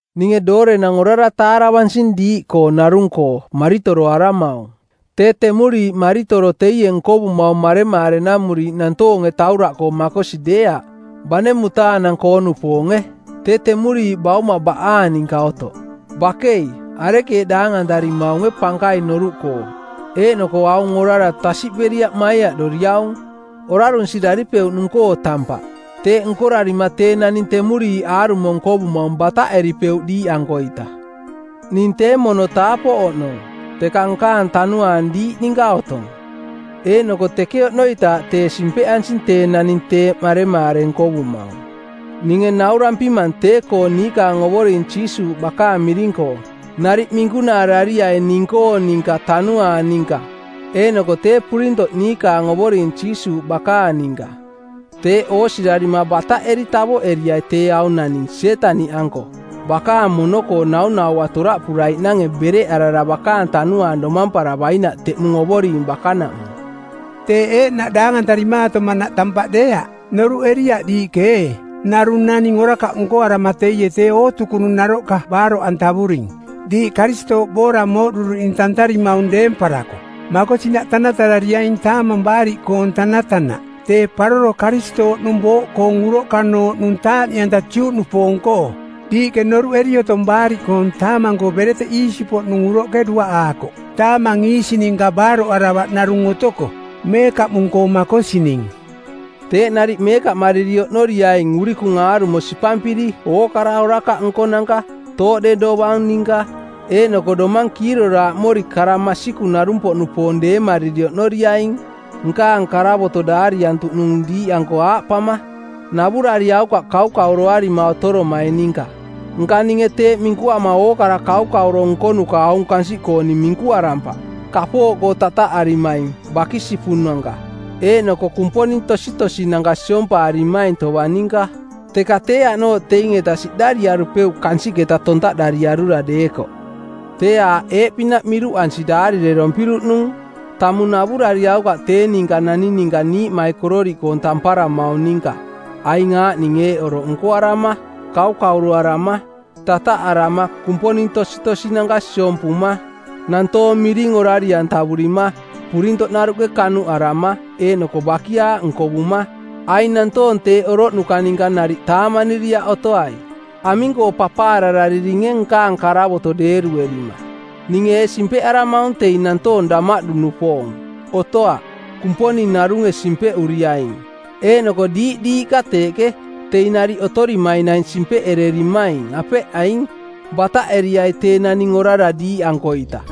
Ninge doorenang orara taaravansing diiꞌkoo narung-koo maritoroaramaung. Tee temuriiꞌ maritoro teie nkovumaung maremaarenamuriiꞌ nantoonge tauraꞌkoo makosi deeaꞌ, bane mutaanang-koo-nupoonge. Tee temuriiꞌ bauma baꞌaang ninka otoꞌ. Bakei, arekeeꞌ daangantarimaunge pankaing noruꞌkoo eeꞌnoko aung orara tasiꞌperiaꞌ maiaꞌdoriaung? Orarunsiraripeuꞌnung-koo tampaꞌ. Teeꞌ nkorarima tee naning temuriiꞌ aarumo nkovumaung bataꞌeripeuꞌ diiꞌankoita. Ning tee mono taapoꞌ oꞌnong, teka nkaang tanuaang diiꞌ ninka otong, eeꞌnoko teke oꞌnoitaaꞌ tee simpeꞌansing tee naning teeꞌ maremaare nkovumaung. Ninge naurampimang tee-koo niikaang Ovoring Jiisuuꞌ bakaang miring-koo: Nariꞌ minkunaarariai ning-koong ninka tanuaang ninka eeꞌnoko tee purintoꞌ niikaang Ovoring Jiisuuꞌ bakaang ninka. Teeꞌ oosirarima bataꞌeri tavoꞌeriai tee aung naning Sietaniꞌanko bakaang mono-koo naunaua toraꞌpuraiꞌnange bereꞌarara bakaang tanuaang domamparavainaꞌ teꞌmung Ovoring bakanaꞌmung. Teeꞌ eeꞌnaꞌ daangantarimaatomanaꞌ tampaꞌ deeaꞌ. Noruꞌeriaꞌ diiꞌke ee narung naning orakaꞌ nkoarama teie tee ootukunung naroꞌka baaroꞌantavuring? Diiꞌ Karistooꞌ boora mooꞌduruꞌning tantarimaung deemparako, makosinaꞌ tanatarariaing Taamang Baariꞌkoong˜ tanatanaꞌ, tee paroro Karistooꞌnung booꞌkoong uroꞌkanooꞌnung taaꞌniꞌanta Juꞌnupoong-koo. Diiꞌke noruꞌeri otong Baariꞌkoong Taamang-koo bereteꞌ iisi-poꞌnung uroꞌke duaꞌaakoꞌ taamang iisi-ninka baaroꞌaravaꞌ narung otoko, meekaꞌmung-koo makosining. Teeꞌ nariꞌ meekaꞌmariri oꞌnoriaing urikung aarumo sipampiri ookara orakaꞌ nkonanka, tooꞌde dovang ninka, eeꞌnoko domang kiiroraaꞌmori kara masikung-narung-poꞌnupoong deemariri oꞌnoriaing. Nkaang karavoto daariantuꞌnung diiꞌanko aaꞌpama, “Navurariaukaꞌ kaukauroarima otoromaing ninka.” Nka ninge teeꞌ minkuama ookara kaukauro nkonuka aung kansiꞌkooning minkuarampaꞌ, kapooꞌkoo tataꞌarimaing, bakisipunanka, eeꞌnoko kumponing tositosinanka siompaarimaing tovang ninka. Teka tee aꞌnooꞌ teing-eta siꞌdariarupeuꞌ kansiꞌketa tontaꞌdariarura deekoꞌ. Tee aaꞌ eeꞌpinaꞌ miruꞌansi daarirerompiruꞌnung: Tamung navurariaukaꞌ tee ninka naning ninka niiꞌmaikororiꞌkoong tamparamaung ninka aing aaꞌning eeꞌ oroꞌ nkoarama: Kaukauroarama, tataꞌarama, kumponing tositosinanka siompuma, nantoong miring orari-antavurima, purintoꞌnaruꞌke kanuꞌarama eeꞌnoko bakiaaꞌ nkovuma. Aing nantoong teeꞌ oroꞌnuka ninka nariꞌ taamaniriaꞌ otoai. Aming-koo papaararariringe nkaang karavoto deeruerima? Ninge ee simpeꞌaramaung teing nantoong damaꞌdu-nupoong? Otoaꞌ. Kumponing narunge simpeꞌuriaing. Eeꞌnoko diiꞌ diiꞌka teeꞌke, teing nariꞌ otorimaing naing simpeꞌererimaing, apeꞌ aing? Bataꞌeriai tee naning orara diiꞌankoita.